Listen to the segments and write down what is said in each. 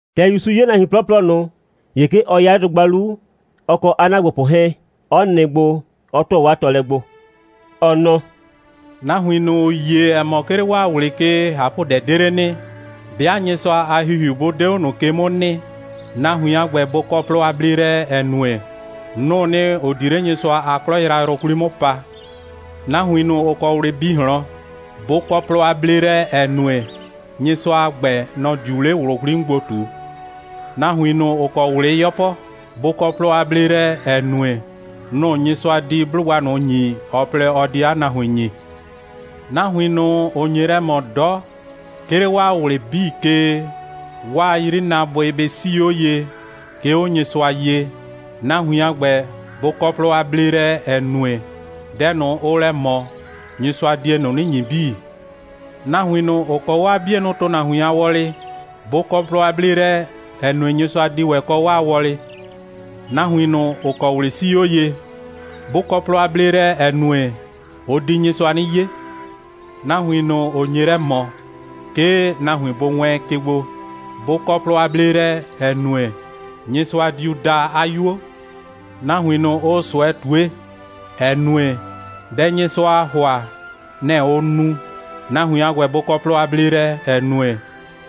‑Tɛ ‑Yusu 'ye nahuin 'plɔplɔ ꞊nʋ, ‑ye 'ke ɔ 'ya 'le dʋgba 'lu, ɔ kɔ 'a ‑naagbopʋ 'hɛɛn, 'ɔ nɩ gbo, 'ɔ ‑tʋa 'waa tɔɔlɛ gbo. Ɔ nɔ: «Nahuin ꞊nʋ, ‑ʋ yie, ‑ɛ mɔ, 'ke 'le 'waa ꞊wlɩ ke, ꞊hapʋdɛ 'de 'le nɩ, 'bɩa Nyɩsʋa a ‑Hihiu 'bʋ 'de 'o ꞊nʋ ke 'mʋ nɩ, nahuin a ‑gbɛ, bʋ kɔ plɔ a bleelɛ, ‑ɛ nue, nʋ‑ʋ nɩ, ‑ʋ di 'le Nyɩsʋa a 'klɔ yrayrʋ 'kwli 'mʋ pa. Nahuin ꞊nʋ, ‑ʋ kɔ ꞊wlɩ bi ꞊hlɔn, bʋ kɔ plɔ a bleelɛ, ‑ɛ nue, Nyɩsʋa a ‑gbɛ, nɔ‑ diu 'le ꞊wlʋ 'kwli 'mʋ gbo ꞊tu. Nahuin ꞊nʋ, ‑ʋ kɔ ꞊wlɩ 'yɔpɔ, bʋ kɔ plɔ a bleelɛ, ‑ɛ nue, nʋ‑ Nyɩsʋa di 'blʋgba ꞊nʋ ‑nyi, ɔ plɛ, ɔ di 'a nahuin ‑nyi. Nahuin ꞊nʋ, ‑ʋ nye lɛ ꞊mɔ 'dɔ, 'ke 'le waa ꞊wlɩ 'bii ke, 'waa 'yrinaabʋɩ bɩ 'sii 'o ye, 'ke 'o Nyɩsʋa ye, nahuin a ‑gbɛ, bʋ kɔ plɔ a bleelɛ, ‑ɛ nue, dɛ ꞊nʋ, ʋʋ lɛ ꞊mɔ, Nyɩsʋa die ꞊nʋ 'nɩ ‑nyi 'bii. Nahuin ꞊nʋ, ‑ʋ kɔ 'waa 'bienʋ ‑tʋnahuin a wɔlɩ, bʋ kɔ plɔ a bleelɛ, ‑ɛ nue, Nyɩsʋa di ‑wɛ kɔ 'waa wɔlɩ. Nahuin ꞊nʋ, ‑ʋ kɔ ꞊wlɩ 'sii 'o ye, bʋ kɔ plɔ a bleelɛ, ‑ɛ nue, ʋ di Nyɩsʋa 'nɩ 'ye. Nahuin ꞊nʋ, ‑ʋ nye lɛ ꞊mɔ, 'ke nahuin bʋ wɛɛn ke gbo, bʋ kɔ plɔ a bleelɛ, ‑ɛ nue, Nyɩsʋa diu daa 'a 'yuo. Nahuin ꞊nʋ, ʋʋ ꞊sʋɛ ꞊tue, ‑ɛ nue, dɛ Nyɩsʋaa ‑hʋa, nɛ‑ ʋʋ nu, nahuin a ‑gbɛ bʋ kɔ plɔ a bleelɛ, ‑ɛ nue,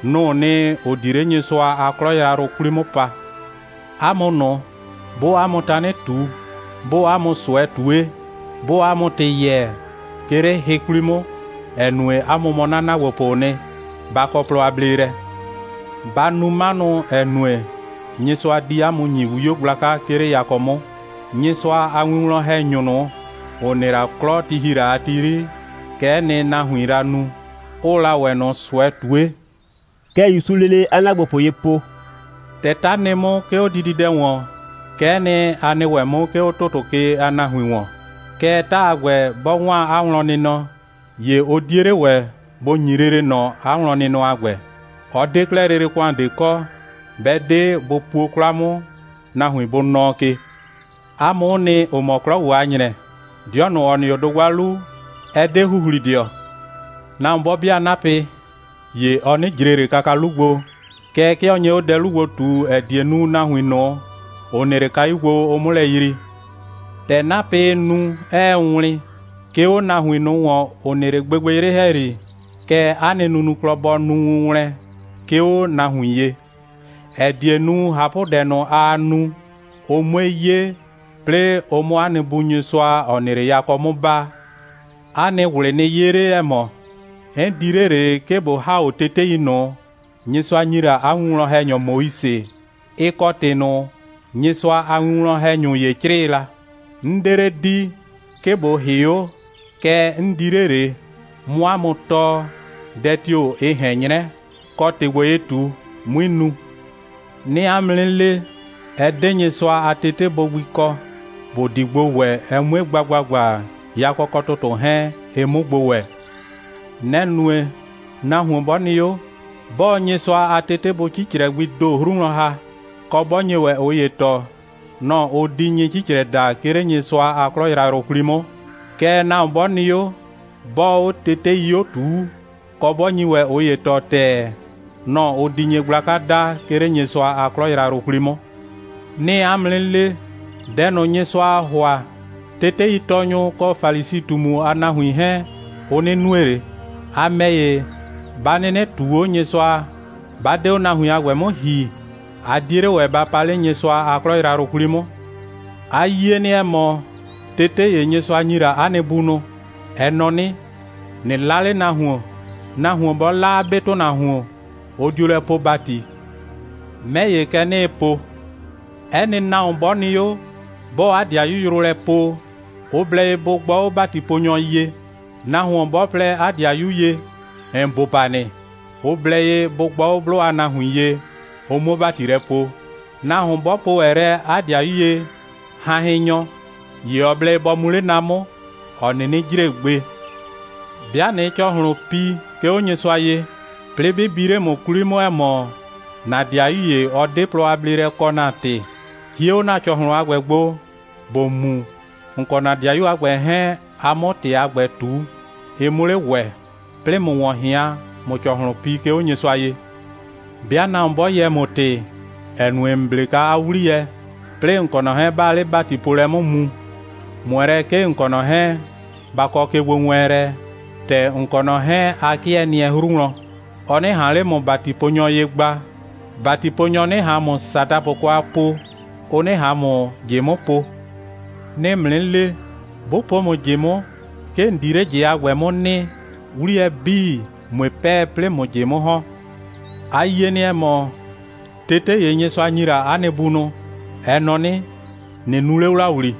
nʋ‑ʋ nɩ, ‑ʋ di 'le Nyɩsʋa a 'klɔ yrayrʋ 'kwli 'mʋ pa. 'A mʋ ꞊nʋ, 'bʋʋ 'a mʋ tanɩ ꞊tu, 'bʋʋ 'a mʋ ꞊sʋɛ ꞊tue, 'bʋʋ 'a mʋ ‑tɩ yɛɛ, 'ke 'le hɩ 'kwli 'mʋ, ‑ɛ nue, 'a mʋ mɔ 'na ‑naagbopʋʋ nɩ, ba kɔ plɔ a bleelɛ. Ba nu 'manʋ, ‑ɛ nue, Nyɩsʋa di 'a mʋ ‑nyi 'wio gblaka, 'ke 'le yakɔ 'mʋ. Nyɩsʋa a winwlɔn‑hɛnyʋ ꞊nʋ, ‑ʋ nɩ la 'klɔ, ti ‑hi la a ti 'yri, kɛ'ɛ nɩ, nahuiin la nu, 'ʋʋ la ‑wɛ ꞊nʋ ꞊sʋɛ ꞊tue.» Kɛ ‑Yusuu lele 'a ‑naagbopʋ ye po: «‑Tɛ 'ta nɩ 'mʋ, 'ke 'o dididɛ ‑wɔn, kɛ'ɛ nɩ, a nɩ ‑wɛ 'mʋ, 'ke 'o ‑tʋtʋ ke a nahuin ‑wɔn. Kɛɛ, 'ta a ‑gbɛ, 'bɔ 'waan 'a wlɔnnɩnɔ, ‑ye ʋ 'die 'le ‑wɛ bʋ ‑nyi lele ꞊nɔ 'a wlɔnnɩnɔ a ‑gbɛ. Ɔ 'de 'klɛɛ lele ‑kʋan ꞊de kɔ, 'bɛ 'de bʋ puo 'kwla 'mʋ, nahuin bʋ nɔɔ ke. 'A mʋ'ʋ nɩ, ‑ʋ mɔ 'klɔ ‑gbo a ‑nyrɛ. 'Dɩɔ ꞊nʋ, ‑ɔ nɩ 'o dʋgba 'lu, ɛ 'de ‑huhlidɩɔ. Nahuon 'bɔ 'bɩa 'napɩ, ‑ye ɔ 'nɩ ꞊jre ꞊le kaka 'lu gbo, kɛɛ, 'ke ɔ nye 'o dɛ 'lu gbo ꞊tu, ‑ɛ die nu, nahuin ꞊nʋ, ‑ʋ nɩ 'le kayu gbo, ʋ 'mʋ lɛ yrii. ‑Tɛ 'napɩɩ nu, 'ɛɛ wlɩn, 'ke 'o nahuin ꞊nʋ ‑wɔn, ‑ʋ nɩ 'le gbɩgbɩyrɩ ‑hɛyri, kɛ 'a nɩ nunuklɔ bɔ nu wʋnwlɛn, 'ke 'o nahuin ye, ‑ɛ die nu, ꞊hapʋdɛ ꞊nʋ, aa nu, ʋ 'mue 'ye, 'plɩɩ ʋ 'mʋ 'a nɩ Bu Nyɩsʋa, ‑ɔ nɩ 'le yakɔ 'mʋ baa.» «'A nɩ ꞊wlɩ nɩ 'ye 'le, ‑ɛ mɔ, 'n di 'le ꞊le, 'ke ꞊bo ‑ha 'o tetei ꞊nʋ, Nyɩsʋa ‑nyi la 'a winwlɔn‑hɛnyɔ Moise, ɩ kɔ ‑tɩ ꞊nʋ, Nyɩsʋa a winwlɔn‑hɛnyʋ ‑ye 'crɩɩ la. 'N 'de 'le di, 'ke ꞊bo ‑hɩ 'o, kɛɛ 'n di 'le ꞊le, 'mʋ 'a mʋ tɔɔ, dɛ tio‑ ɩ ꞊hɛn 'nyrɛ, kɔ, ‑tɩ ‑gbo, ɩɩ ꞊tu, 'mui nu. 'Nɩɩ 'a mʋ 'nɩ le, ɛ 'de Nyɩsʋa a tetebʋ gbi kɔ, ‑bʋ di gbo ‑wɛ, ɛ 'mue gba ‑gbagba, yakɔ kɔ ‑tʋtʋ 'hɛɛn, ɩ 'mʋ gbo ‑wɛ. Nɛ‑ nue, nahuon 'bɔ nɩ 'o, 'bɔɔ Nyɩsʋa a tetebʋ 'cicrɛ gbii ‑do 'hru wlɔn ‑ha, kɔ, 'bɔ nye ‑wɛ ꞊ʋ ‑ye tɔɔ, nɔ‑ ʋ di nyɩ'cicrɛ daa, 'ke 'le Nyɩsʋa a 'klɔ yrayrʋ 'kwli 'mʋ. Kɛɛ, nahuon 'bɔ nɩ 'o, 'bɔɔ 'o tetei 'o ꞊tuu, kɔ, 'bɔ nyi ‑wɛ ꞊ʋ ‑ye tɔɔ ‑tɛɛ, nɔ‑ ʋ di nyɩgblaka daa, 'ke 'le Nyɩsʋa a 'klɔ yrayrʋ 'kwli 'mʋ. 'Nɩɩ 'a mʋ 'nɩ le: Dɛ ꞊nʋ, Nyɩsʋaa ‑hʋa, teteitɔɔnyʋ kɔ Falisi꞊tumu a nahuin 'hɛɛn, ʋ 'nɩ nue ꞊le. A ‑mɛ ‑ye, 'ba 'nɩnɩ ꞊tuu 'o Nyɩsʋa, 'ba 'de 'o nahuin a ‑gbɛ 'mʋ ‑hi, a 'die 'le ‑wɛ ba pa 'le Nyɩsʋa a 'klɔ yrayrʋ 'kwli 'mʋ.» «A yie nɩ, ‑ɛ mɔ, tete ‑ye, Nyɩsʋa ‑nyi la ‑a nɩ bunʋ, ɛ nɔ 'nɩ: ꞊Nɩ 'la 'le nahuon. Nahuon 'bɔ 'la 'a 'be ‑tʋnahuon, ʋ dio lɛ poo ‑bati. 'Mɛ ‑ye, kɛ 'nɩɩ po: 'Ɛ nɩ nahuon 'bɔ nɩ 'o, 'bɔɔ 'a 'dɩayu yrʋ lɛ poo, ʋ blɛ ye bʋ gbɔ 'o ‑batiponyɔ ye. Nahuon 'bɔ po lɛ 'a 'dɩayu ye: ‑N bʋba nɩ, ʋ blɛ ye bʋ gbɔ 'o 'blʋ a nahuin ye, ʋ 'muo ‑bati lɛ poo. Nahuon 'bɔ po ‑wɛ lɛ 'a 'dɩayu ye: Hanhɩnnyɔ, ‑ye ɔ blɛ ye bɔ mu 'le na ꞊nʋ 'mʋ, ‑ɔ 'nɩnɩ jre gbe. 'Bɩa ꞊nɩɩ ‑cɔhlʋn pi, 'ke 'o Nyɩsʋa ye, 'plɩɩ 'bɩ bi 'le ‑mʋ 'kwli 'mʋ, ‑ɛ mɔ, ‑na 'dɩayu ‑ye, ɔ 'de plɔ a bleelɛ kɔ ‑na ‑tɩ, hie 'o ‑na ‑cɔhlʋn a ‑gbɛ gbo, ‑bo mu, ‑n kɔ ‑na 'dɩayu a ‑gbɛ 'hɛɛn, a 'mʋ ‑tɩ a ‑gbɛ ꞊tu, ɩ 'mʋ 'le ‑wɛ, 'plɩɩ ꞊mʋ ‑wɔn ꞊hɩan, ꞊mʋ ‑cɔhlʋn pi, 'ke 'o Nyɩsʋa ye. 'Bɩa nahuon 'bɔ yɛɛ ‑mʋ ‑tɩ, ‑ɛ nue, ‑n 'ble kwa 'a 'wliyɛ, 'plɩɩ ‑n kɔ ꞊nɔ 'hɛɛn, 'baa 'le ‑batipoolɛ 'mʋ mu, ꞊mʋɛ lɛ, 'ke ‑n kɔ ꞊nɔ 'hɛɛn, ba kɔ kegbowɛɛnlɛ, ‑tɛ ‑n kɔ ꞊nɔ 'hɛɛn, a 'kɩɛ nɩɛ 'hru wlɔn, ɔ 'nɩ ꞊han 'le ‑mʋ ‑batiponyɔ ye gba, ‑batiponyɔ 'nɩ ꞊han ‑mʋ ‑sadapʋ kwa po, ʋ 'nɩ ꞊han ‑mʋ ꞊jɩ 'mʋ po. 'Nɩɩ ‑mʋ 'nɩ le, 'bʋ po ‑mʋ ꞊jɩ 'mʋ, 'ke ‑n di 'le ꞊jɩ a ‑gbɛ 'mʋ nɩ, 'wliyɛ 'bii, ꞊mue 'pɛɛ, 'plɩɩ ꞊mʋ ꞊jɩ 'mʋ ‑hɔn.» «A yie nɩ, ‑ɛ mɔ, tete ‑ye, Nyɩsʋa ‑nyi la ‑a nɩ bunʋ, ɛ nɔ 'nɩ: ꞊Nɩ nu 'le ‑wlawli.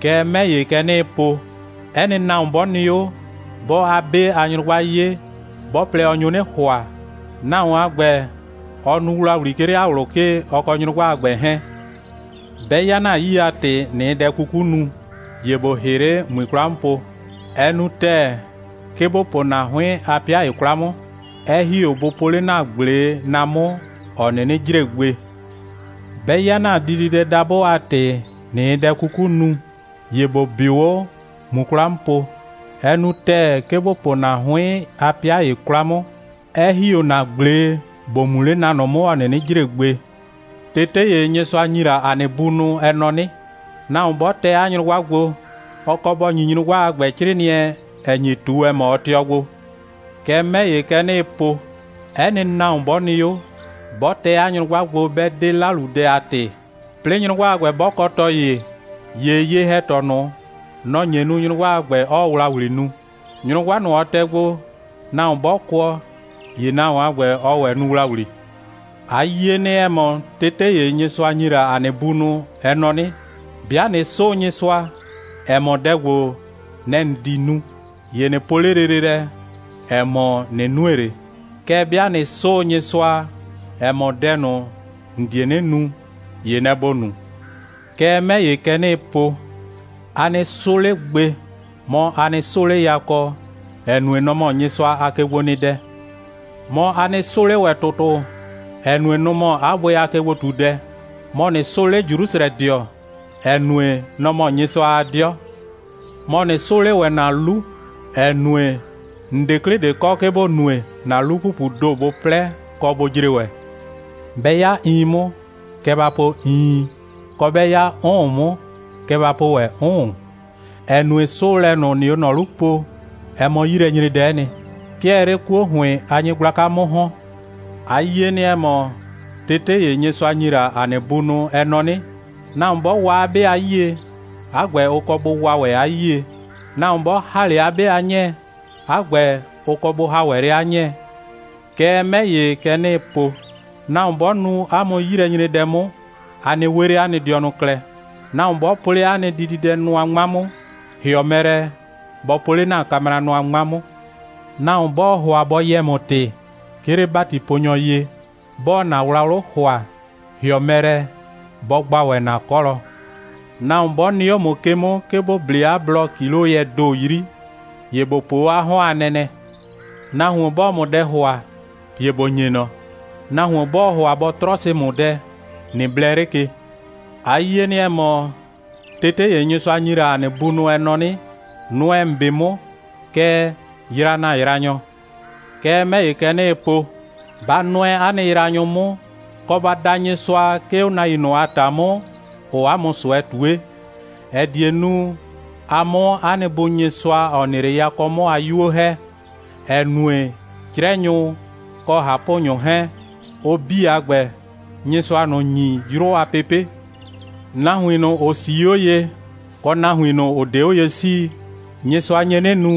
Kɛɛ, 'mɛ ‑ye, kɛ 'nɩɩ po, 'ɛ nɩ nahuon 'bɔ nɩ 'o, 'bɔɔ 'a 'be a nyrʋgba 'ye, 'bɔ plɛ, ɔ nyo 'nɩ ‑hʋa, nahuon a ‑gbɛ, ɔ nu ‑wlawli, 'ke 'le 'a ꞊wlʋ ke, ɔ kɔ nyrʋgba a ‑gbɛ 'hɛɛn. 'Bɛ 'ya ‑na 'yii a ‑tɩ, ꞊nɩɩ dɛ 'kuku nu, ‑ye ‑bo ‑hɩ 'le, ꞊mui 'kwla 'mʋ po. Ɛ nu ‑tɛɛ, 'ke ‑bo po ‑na 'hʋɩn a 'pɩa ‑ye 'kwla 'mʋ, 'ɛ ‑hi 'o bʋ po 'le ‑na ꞊gble na ꞊nʋ 'mʋ, ‑ɔ 'nɩnɩ jre gbe. 'Bɛ 'ya ‑na diidɛdabʋ a ‑tɩ, ꞊nɩɩ dɛ 'kuku nu, ‑ye ‑bo 'bɩʋ 'o, ꞊mu 'kwla 'mʋ po. Ɛ nu ‑tɛɛ, 'ke ‑bo po ‑na 'hʋɩn a 'pɩa ‑ye 'kwla 'mʋ, 'ɛ ‑hi 'o ‑na ꞊gble ‑bo mu 'le na ꞊nʋ 'mʋ, ‑ɔ 'nɩnɩ jre gbe.» «Tete ‑ye, Nyɩsʋa ‑nyi la ‑a nɩ bunʋ, ɛ nɔ 'nɩ: Nahuon 'bɔ tɛ 'a nyrʋgba gbo, ɔ kɔ bɔ ‑nyi nyrʋgba a ‑gbɛ 'crɩɩnɩɛ, ‑ɛ nyi ꞊tu, ‑ɛ mɔ, ɔ tɩɔ gbo. Kɛɛ, 'mɛ ‑ye, kɛ 'nɩɩ po: 'Ɛ nɩ nahuon 'bɔ nɩ 'o, 'bɔ tɛ 'a nyrʋgba gbo, 'bɛ 'de 'laludɛ a ‑tɩ, 'plɩɩ nyrʋgba a ‑gbɛ 'bɔ kɔ tɔ ‑ye, ‑ye ye‑hɛtɔ ꞊nʋ, nɔ‑ nye nu, nyrʋgba a ‑gbɛ, 'ɔɔ ‑wlawli nu. Nyrʋgba ꞊nʋ, ɔ tɛ gbo, nahuon 'bɔ kʋɔ, ‑ye nahuon a ‑gbɛ, ɔɔ ‑wɛ nu ‑wlawli.» «A yie nɩ, ‑ɛ mɔ, tete ‑ye, Nyɩsʋa ‑nyi la ‑a nɩ bunʋ, ɛ nɔ 'nɩ: 'Bɩa ꞊nɩ 'sʋʋ Nyɩsʋa, ‑ɛ mɔ, dɛ ‑gbo, nɛ‑ ‑n di nu, ‑ye ꞊nɩ po 'le lele lɛ, ‑ɛ mɔ, ꞊nɩ nue ꞊le. Kɛɛ, 'bɩa ꞊nɩ 'sʋʋ Nyɩsʋa, ‑ɛ mɔ, dɛ ꞊nʋ, ‑n die 'nɩ nu, ‑ye nɛ‑ ‑bo nu. Kɛɛ, 'mɛ ‑ye, kɛ 'nɩɩ po: A nɩ 'sʋ 'le gbe. Mɔ, a nɩ 'sʋʋ 'le yakɔ, ‑ɛ nue, nɔ‑ mɔ Nyɩsʋa a kegbonɩdɛ. Mɔ, a nɩ 'sʋʋ 'le ‑wɛ ‑tʋtʋ, ‑ɛ nue, nʋ‑ mɔ 'a bʋɩ a kegbo꞊tudɛ. Mɔ, ꞊nɩ 'sʋʋ 'le Jrusrɛdɩɔ, ‑ɛ nue, nɔ‑ mɔ Nyɩsʋa a 'dɩɔ. Mɔ, ꞊nɩ 'sʋʋ 'le ‑wɛ ‑na 'lu, ‑ɛ nue, ‑n 'de 'klɩ ꞊de kɔ, 'ke ‑bo nue, ‑na 'lu‑pupuu ‑do bʋ 'plɛ, kɔ, bʋ jre ‑wɛ. 'Bɛ 'ya iin 'mʋ, kɛ ba po: Iin, kɔ, 'bɛ 'ya 'ʋʋn 'mʋ, kɛ ba po ‑wɛ: 'Ʋʋn, ‑ɛ nue, 'sʋʋlɛ ꞊nʋ, ‑nɩɩ 'o ꞊nɔ 'lu po, ɛ mɔ 'yilɛnyredɛ'ɛ nɩ. 'Ke ɛɛ 'le 'kuo ‑hʋɩn a nyɩgblaka 'mʋ ‑hɔn.» «A yie nɩ, ‑ɛ mɔ, tete ‑ye, Nyɩsʋa ‑nyi la ‑a nɩ bunʋ, ɛ nɔ 'nɩ: Nahuon 'bɔ wa 'a 'be a 'yie, 'a ‑gbɛ, ʋ kɔ bʋ wa ‑wɛ 'a 'yie. Nahuon 'bɔ ‑ha 'le 'a 'be a 'nyɛɛ, 'a ‑gbɛ, ʋ kɔ bʋ ‑ha ‑wɛ 'le 'a 'nyɛɛ. Kɛɛ, 'mɛ ‑ye, kɛ 'nɩɩ po: Nahuon 'bɔ nu 'a mʋ 'yilɛnyredɛ 'mʋ, a nɩ 'we 'le 'a nɩ dɩɔnʋ klɛ. Nahuon 'bɔ po 'le ‑na diidɛnʋa 'ŋma 'mʋ, ‑hɩɔ mɛ lɛ, bɔ po 'le ‑na kamranʋa 'ŋma 'mʋ. Nahuon 'bɔɔ ‑hʋa bɔ yɛɛ ‑mʋ ‑tɩ, 'ke 'le ‑batiponyɔ ye, 'bɔɔ ‑na wlawlʋ ‑hʋa, ‑hɩɔ mɛ lɛ bɔ gba ‑wɛ ‑na 'kɔlɔ. Nahuon 'bɔ nɩ 'o ‑mʋ ke 'mʋ, 'ke ‑bo 'ble 'a blɔ ‑kiloyɛɛ ‑do 'yri, ‑ye ‑bo po 'o 'a 'hɔn a nɛnɛ. Nahuon 'bɔɔ ‑mʋ dɛ ‑hʋa, ‑ye ‑bo ‑nye ꞊nɔ. Nahuon 'bɔɔ ‑hʋa bɔ 'trɔsɩ ‑mʋ dɛ, ꞊nɩ blɛ 'le ke.» «A yie nɩ, ‑ɛ mɔ, tete ‑ye, Nyɩsʋa ‑nyi la ‑a nɩ bunʋ, ɛ nɔ 'nɩ: Nʋɛ ‑n 'be 'mʋ, kɛɛ, yraa ‑na yraanyɔ. Kɛɛ, 'mɛ ‑ye, kɛ 'nɩɩ po: Ba nʋɛ 'a nɩ yraanyʋ 'mʋ, kɔ, ba da Nyɩsʋa, 'ke 'o nahuin ꞊nʋ a ‑ta 'mʋ, ‑ʋʋ 'a mʋ ꞊sʋɛ ꞊tue, ‑ɛ die nu, a 'mʋ 'a nɩ Bu Nyɩsʋa, ‑ɔ nɩ 'le yakɔ 'mʋ a 'yuo ‑hɛ, ‑ɛ nue, 'crɛnyʋ kɔ ꞊hapʋnyʋ 'hɛɛn, ʋ 'bii a ‑gbɛ, Nyɩsʋaa ꞊nʋ ‑nyi 'yrʋ a pepe'. Nahuin ꞊nʋ, ‑ʋ 'sii 'o ye, kɔ nahuin ꞊nʋ, ‑ʋ 'de 'o ye 'sii, Nyɩsʋa nye 'nɩ nu,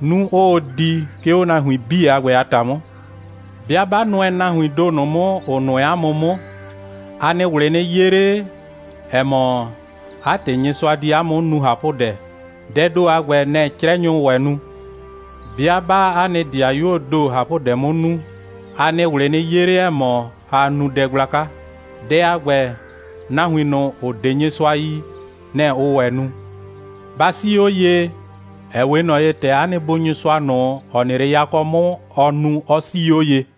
'nu 'ʋʋ di, 'ke 'o nahuin 'bii a ‑gbɛ a ‑ta 'mʋ. 'Bɩa 'ba nʋɛ nahuiin ‑do ꞊nʋ 'mʋ, ‑ʋ nʋɛ 'a mʋ 'mʋ, 'a nɩ ꞊wlɩ nɩ 'ye 'le, ‑ɛ mɔ, 'a ‑tɩ Nyɩsʋa di 'a mʋ 'mʋ nu ꞊hapʋdɛ. Dɛɛ ‑do a ‑gbɛ, nɛ‑ 'crɛnyʋʋ ‑wɛ nu. 'Bɩa 'baa 'a nɩ 'dɩayuoo ‑do ꞊hapʋdɛ 'mʋ nu, 'a nɩ ꞊wlɩ nɩ 'ye 'le, ‑ɛ mɔ, aa nu dɛ gblaka. Dɛ a ‑gbɛ, nahuin ꞊nʋ, ‑ʋ 'de Nyɩsʋa yi, nɛ‑ ʋʋ ‑wɛ nu. Ba 'sii 'o ye, ‑ɛ 'we ꞊nɔ ye, ‑tɛ 'a nɩ Bu Nyɩsʋa ꞊nʋ, ‑ɔ nɩ 'le yakɔ 'mʋ, ɔ nu, 'ɔ 'sii 'o ye.»